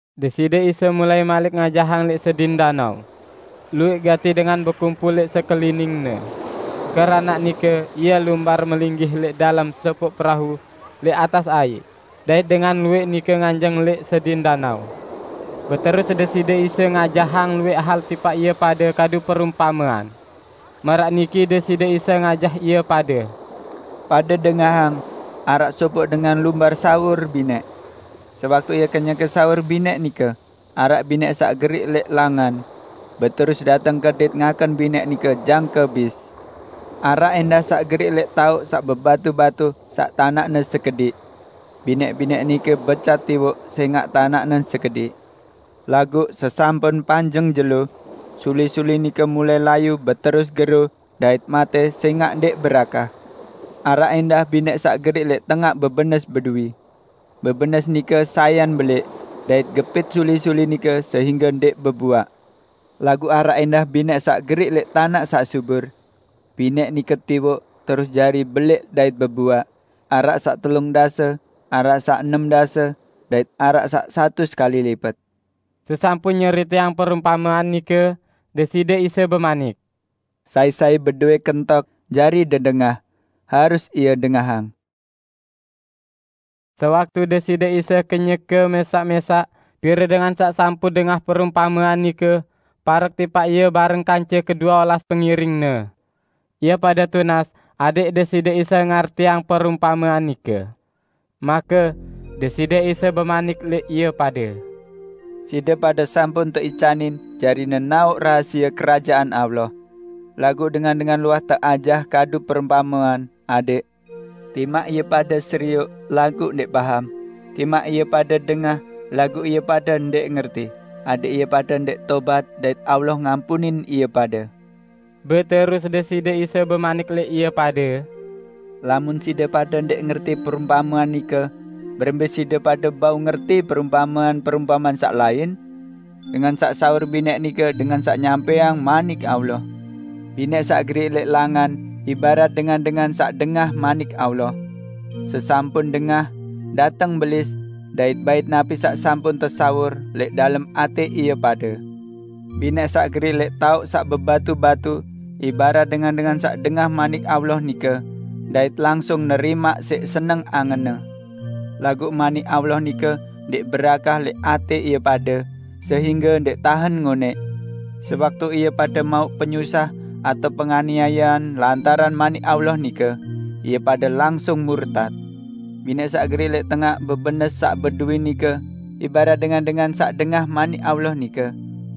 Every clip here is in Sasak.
Deside Isa mulai malik ngajahang lẽq sedin danao. Luwẽq gati dengan bekumpul lẽq sekelining-Ne. Keranaq nike Ie lumbar melinggih lẽq dalem sopoq perau lẽq atas aiq, dait dengan luwẽq nike nganjeng lẽq sedin danao. Beterus Deside Isa ngajahang luwẽq hal tipaq ie pade kadu perumpamean. Maraq niki Deside Isa ngajah ie pade. "Pade dengahang! Araq sopoq dengan lumbar sawur binẽq. Sewaktu ie kenyeke sawur binẽq nike, araq binẽq saq geriq lẽq langan. Beterus dateng kedit ngaken binẽq nike jangke bis. Araq ẽndah saq geriq lẽq taoq saq bebatu-batu saq tanaqne sekediq. Binẽq-binẽq nike becat tiwoq sẽngaq tanaqne sekediq, laguq sesampun panjeng jelo, suli-suli nike mulai layu beterus gero dait matẽ sẽngaq ndẽq berakah. Araq ẽndah binẽq saq geriq lẽq tengaq bebenes beduwi. Bebenes nike sayan belẽq, dait gepit suli-suli nike sehingge ndẽq bebuaq. Laguq araq ẽndah binẽq saq geriq lẽq tanaq saq subur. Binẽq nike tiwoq, terus jari belẽq dait bebuaq, araq saq telung dase, araq saq enem dase, dait araq saq satus kali lipet." Sesampun nyeriteang perumpamean nike, Deside Isa bemanik, "Sai-sai bedowẽ kentok jari dedengah, harus ie dengahang!" Sewaktu Deside Isa kenyeke mẽsaq-mẽsaq, pire dengan saq sampun dengah perumpamean nike parek tipaq Ie bareng kance kedue olas pengiring-Ne. Ie pade tunas adẽq Deside Isa ngartiang perumpamean nike. Make Deside Isa bemanik lẽq ie pade, "Side pade sampun teicanin jari nenaoq rahasie Kerajaan Allah. Laguq dengan-dengan luah teajah kadu perumpamean, adẽq: 'Timaq ie pade serioq laguq ndẽq paham, timaq ie pade dengah laguq ie pade ndẽq ngerti, adẽq ie pade ndẽq tobat dait Allah ngampunin ie pade.' " Beterus Deside Isa bemanik lẽq ie pade, "Lamun side pade ndẽq ngerti perumpamean nike, berembẽ side pade bau ngerti perumpamean-perumpamean saq lain? Dengan saq sawur binẽq nike dengan saq nyampẽang Manik Allah. Binẽq saq geriq lẽq langan ibarat dengan-dengan saq dengah Manik Allah. Sesampun dengah, dateng Belis dait bait napi saq sampun tesawur lẽq dalem atẽ ie pade. Binẽq saq geriq lẽq taoq saq bebatu-batu ibarat dengan-dengan saq dengah Manik Allah nike, dait langsung nerimaq siq seneng angenne. Laguq Manik Allah nike ndẽq berakah lẽq atẽ ie pade, sehingge ndẽq tahen ngonẽq. Sewaktu ie pade mauq penyusah atao penganiayean lantaran Manik Allah nike, ie pade langsung murtat. Binẽq saq geriq lẽq tengaq bebenes saq beduwi nike ibarat dengan-dengan saq dengah Manik Allah nike,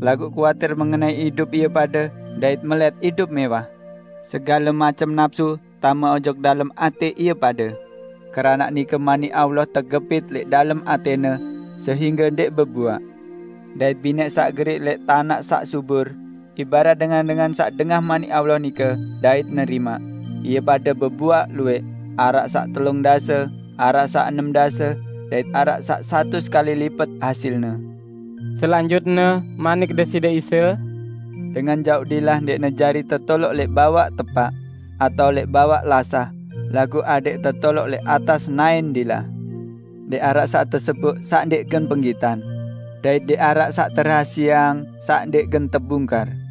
laguq kuatir mengenai idup ie pade dait melẽt idup mẽwah. Segale macem napsu tame ojok dalem atẽ ie pade. Keranaq nike Manik Allah tegepit lẽq dalem atẽne sehingge ndẽq bebuaq. Dait binẽq saq geriq lẽq tanaq saq subur ibarat dengan-dengan saq dengah Manik Allah nike, dait nerimaq, ie pade bebuaq luwẽq, araq saq telung dase, araq saq enem dase dait araq saq satus kali lipet hasilne." Selanjutne manik Deside Isa, "Dengan jauq dilah ndẽqne jari tetoloq lẽq bawaq tepaq atao lẽq bawaq lasah, laguq adẽq tetoloq lẽq atas naẽn dilah. Ndẽq araq saq teseboq, saq ndẽq gen penggitan; dait ndẽq araq saq terahasieang saq ndẽq gen tebungkar.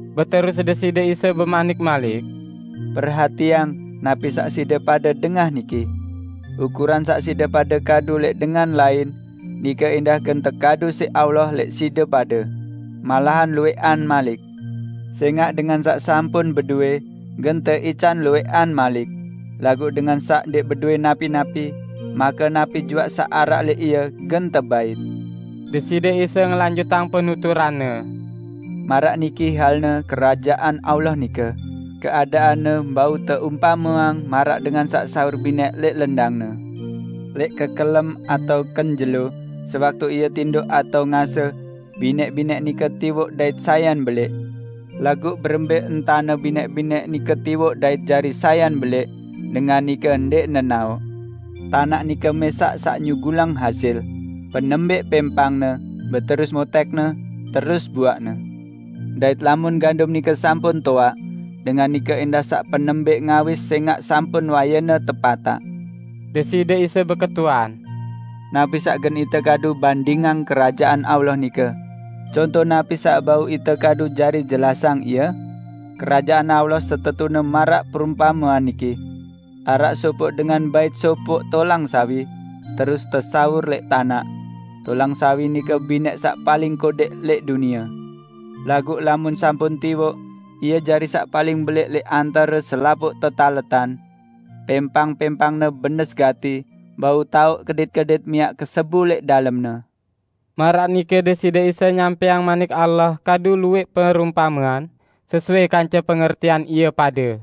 Beterus Deside Isa bemanik malik, "Perhatiang napi saq side pade dengah niki! Ukuran saq side pade kadu lẽq dengan lain, nike ẽndah gen tekadu siq Allah lẽq side pade -- malahan luwẽqan malik. Sẽngaq dengan saq sampun bedowẽ, gen teican luwẽqan malik; laguq dengan saq ndẽq bedowẽ napi-napi, make napi juaq saq araq lẽq ie gen tebait." Deside Isa ngelanjutang penuturan-Ne, "Maraq niki halne Kerajaan Allah nike, keadaanne bau teumpameang maraq dengan saq sawur binẽq lẽq lendangne. Lẽq kekelem atao kenjelo, sewaktu ie tindoq atao ngase, binẽq-binẽq nike tiwoq dait sayan belẽq. Laguq berembẽ entane binẽq-binẽq nike tiwoq dait jari sayan belẽq dengan nike ndẽq nenaoq. Tanaq nike mẽsaq saq nyugulang hasil: Penembẽq pẽmpangne, beterus motẽkne, terus buaqne. Dait lamun gandum nike sampun toaq, dengan nike ẽndah saq penembẽq ngawis sẽngaq sampun wayene tepataq." Deside Isa beketuan, "Napi saq gen ite kadu bandingang Kerajaan Allah nike? Conto napi saq bau ite kadu jari jelasang ie? Kerajaan Allah setetune maraq perumpamean niki: Araq sopoq dengan bait sopoq tolang sawi, terus tesawur lẽq tanaq. Tolang sawi nike binẽq saq paling kodẽq lẽq dunie. Laguq lamun sampun tiwoq, ie jari saq paling belẽq lẽq antare selapuq tetaletan. Pẽmpang-pẽmpangne benes gati bau taoq kedit-kedit miaq kesebu lẽq dalemne." Maraq nike Deside Isa nyampẽang Manik Allah kadu luwẽq perumpamean, sesuai kance pengertian ie pade.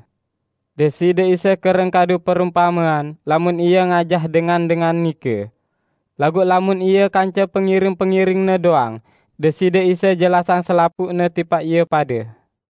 Deside Isa kereng kadu perumpamean lamun Ie ngajah dengan-dengan nike. Laguq lamun Ie kance pengiring-pengiring-Ne doang, Deside Isa jelasang selapuqne tipaq ie pade.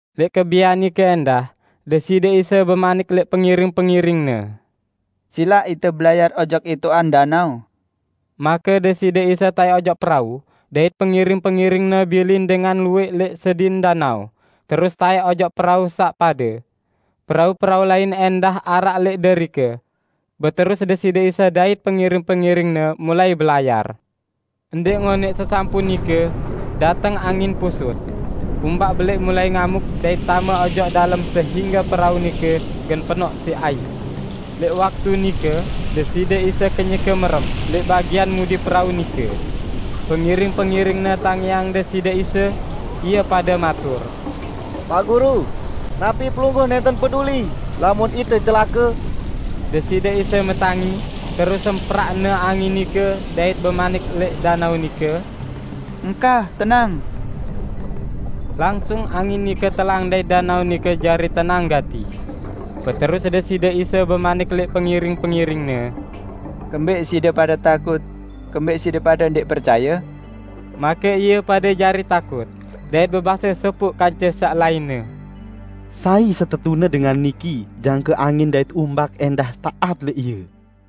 Lẽq kebian nike ẽndah, Deside Isa bemanik lẽq pengiring-pengiring-Ne, "Silaq ite belayar ojok itoqan danao." Make Deside Isa taẽk ojok perau, dait pengiring-pengiring-Ne bilin dengan luwẽq lẽq sedin danao, terus taẽk ojok perau saq pade. Perau-perau lain ẽndah araq lẽq derike. Beterus Deside Isa dait pengiring-pengiring-Ne mulai belayar. Ndẽq ngonẽq sesampun nike, dateng angin pusut. Umbak belẽq mulai ngamuk dait tame ojok dalem sehingge perau nike gen penoq siq aiq. Lẽq waktu nike Deside Isa kenyeke merem lẽq bagian mudi perau nike. Pengiring-pengiring-Ne tangiang Deside Isa. Ie pade matur, "Paq Guru! Napi Pelungguh nẽnten peduli, lamun ite celake?" Deside Isa metangi, terus semprak-Ne angin nike dait bemanik lẽq danao nike, "Engkah, tenang!" Langsung angin nike telang dait danao nike jari tenang gati. Beterus Deside Isa bemanik lẽq pengiring-pengiring-Ne, "Kembẽq side pade takut? Kembẽq side pade ndẽq percaye?" Make ie pade jari takut, dait bebase sopoq kance saq lainne, "Sai setetune dengan niki jangke angin dait umbak ẽndah taat lẽq Ie."